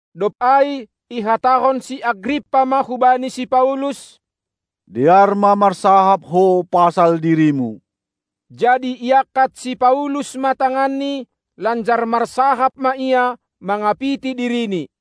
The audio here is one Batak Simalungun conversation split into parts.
Dob ai ihatahon si Agrippa ma hubani si Paulus: Dear ma marsahap ho pasal dirimu! Jadi iangkat si Paulus ma tanganni, lanjar marsahap ma ia mangapiti dirini.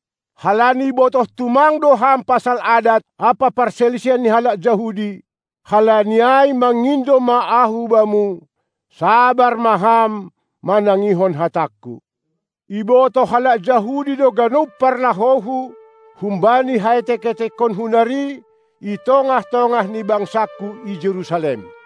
halani botoh tumang do ham pasal adat ampa parsalisihan ni halak Jahudi; halani ai mangindo ma ahu bamu: Sabar ma ham manangihon hatangku! Ibotoh halak Jahudi do ganup parlahouhu humbani haetek-etekonku nari i tongah-tongah ni bangsangku i Jerusalem.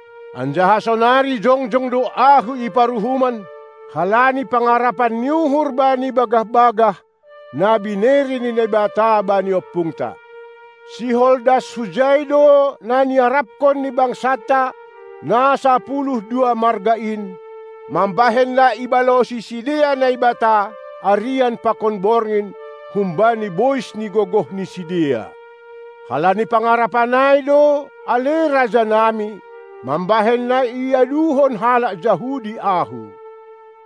Anjaha sonari jongjong do ahu i paruhuman, halani pangarapan ni uhur bani bagah-bagah, na binere ni Naibata bani ompungta. Sihol das hujai do na niarapkon ni bangsanta na sapuluh dua marga in, mambahen na ibalosi sidea Naibata arian pakon borngin humbani bois ni gogoh ni sidea. Halani pangarapan ai do, ale raja nami, mambahen na iaduhon halak Jahudi ahu.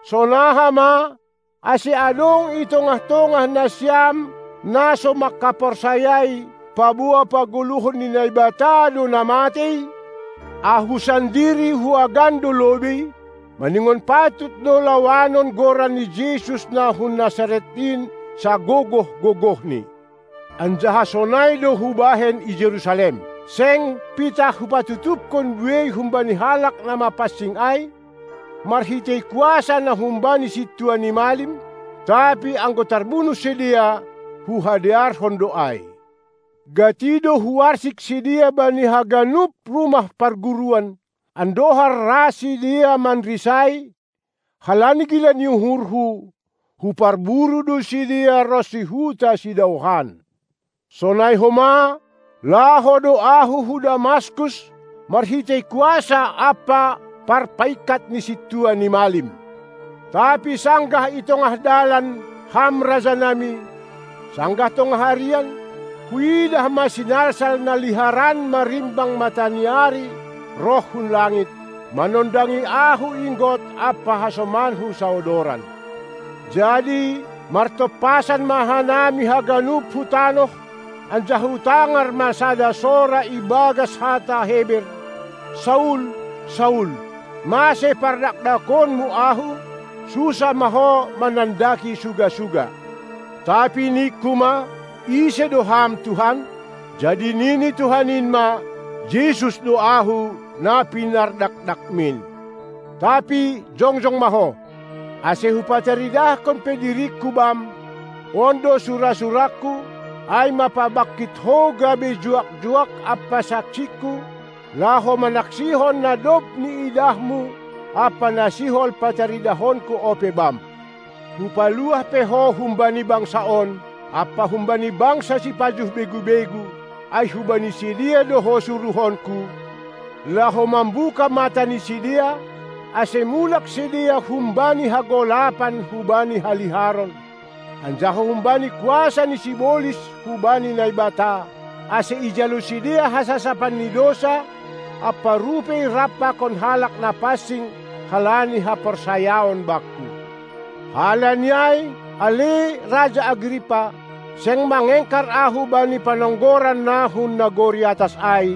Sonaha ma, ase adong i tongah-tongah nasiam na so mangkaporsayai, paboa pagoluhon ni Naibata do na matei? Ahu sandiri huagan do lobei, maningon patut do lawanon Goran ni Jesus na hun Nasaret in sagogoh-gogohni. Anjaha sonai do hubahen i Jerusalem. Seng pitah hupatutupkon buei humbani halak na mapansing ai, marhitei kuasa na humbani sintua ni malim, tapi anggo tarbunuh sidea, huhadearhon do ai. Gati do huarsik sidea bani haganup rumah parguruan, andohar ra sidea manrisai; halani gila ni uhurhu, huparburu do sidea ronsi huta sidaohan. Sonai homa laho do ahu hu Damaskus marhitei kuasa ampa parpaingkat ni sintua ni malim. Tapi sanggah i tongah dalan, ham rajanami, sanggah tongah arian, huidah ma sinalsal na liharan marimbang mataniari roh hun langit, manondangi ahu inggot ampa hasomanku saodoran. Jadi martompasan ma hanami haganup hu tanoh, anjaha hutangar ma sada sora ibagas hata Heber: Saul, Saul! Mase pardakdakonmu Ahu? Sunsah ma ho manandaki suga-suga! Tapi ningku ma: Ise do Ham, Tuhan? Jadi nini Tuhan in ma: Jesus do Ahu, na pinardakdakmin! Tapi jongjong ma ho! Ase Hupataridahkon pe diringKu bam, on do sura-surangKu, ai ma pabangkit ho gabe juak-juak ampa saksingKu, laho manaksihon na dob niidahmu ampa na sihol pataridahonKu ope bam! Hupaluah pe ho humbani bangsa on ampa humbani bangsa sipajuh begu-begu, ai hubani sidea do ho suruhonKu, laho mambuka mata ni sidea, ase mulak sidea humbani hagolapan hubani haliharon, anjaha humbani kuasa ni sibolis hubani Naibata, ase ijalo sidea hasasapan ni dousa ampa rupei rap pakon halak na pansing, halani haporsayaon Bakku. Halani ai, ale raja Agrippa, seng mangengkar ahu bani panonggoran na hun nagori atas ai,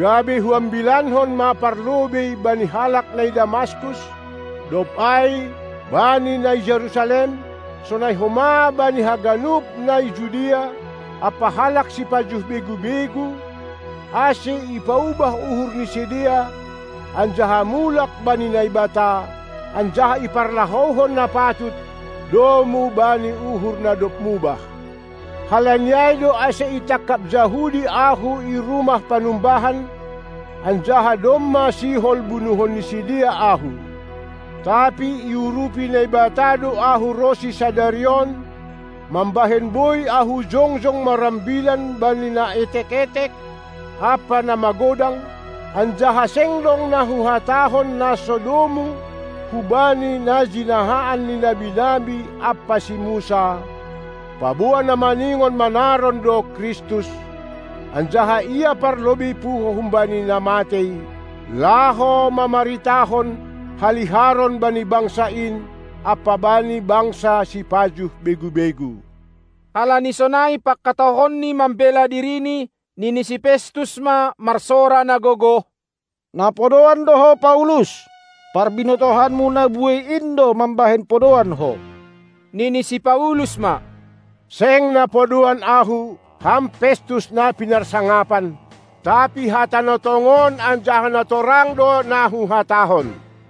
gabe huambilankon ma parlobei bani halak na i Damaskus, dob ai bani na i Jerusalem, sonai homa bani haganup na i Judea ampa halak sipajuh begu-begu, ase ipaubah uhur ni sidea anjaha mulak bani Naibata, anjaha iparlahouhon na patut domu bani uhur na dob mubah. Halani ai do ase itangkap Jahudi ahu i rumah panumbahan, anjaha domma sihol bunuhon ni sidea ahu. Tapi iurupi Naibata do ahu ronsi sadari on, mambahen boi ahu jongjong marambilan bani na etek-etek ampa na magodang, anjaha seng dong na huhatahon na so domu hubani na jinahaan ni nabi-nabi ampa si Musa, paboa, na maningon manaron do Kristus, anjaha Ia parlobei puho humbani na matei, laho mamaritahon haliharon bani bangsa in ampa bani bangsa sipajuh begu-begu. Halani sonai pangkatahonni mambela dirini, nini si Festus ma marsora na gogoh: Na podoan do ho Paulus! Parbinotohanmu na buei in do mambahen podoan ho. Nini si Paulus ma: Seng na podoan ahu, ham Festus, na pinarsangapan, tapi hata na tongon anjaha na torang do na huhatahon.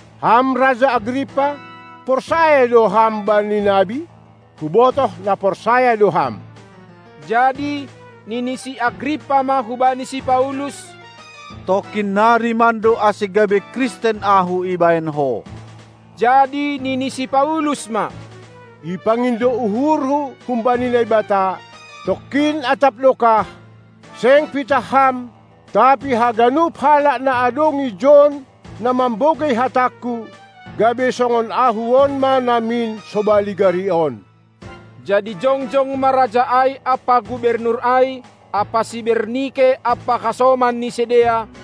Ham raja Agrippa, porsaya do ham bani nabi? Hubotoh na porsaya do ham! Jadi nini si Agrippa ma hubani si Paulus: Tongkin nari mando ase gabe Kristen ahu ibahen ho. Jadi nini si Paulus ma: Ipangindo uhurhu humbani Naibata, tongkin atap dokah, seng pitah ham, tapi haganup halak na adong ijon na mambogei hatangku, gabe songon ahu on ma namin sobali gari on. Jadi jongjong ma raja ai ampa gubernur ai ampa si Bernike ampa hasoman ni sidea,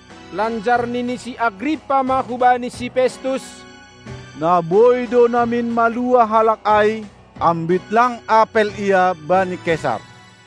Lanjar nini si Agrippa ma hubani si Festus: Na boi do namin maluah halak ai, ambit lang apel ia bani Kesar.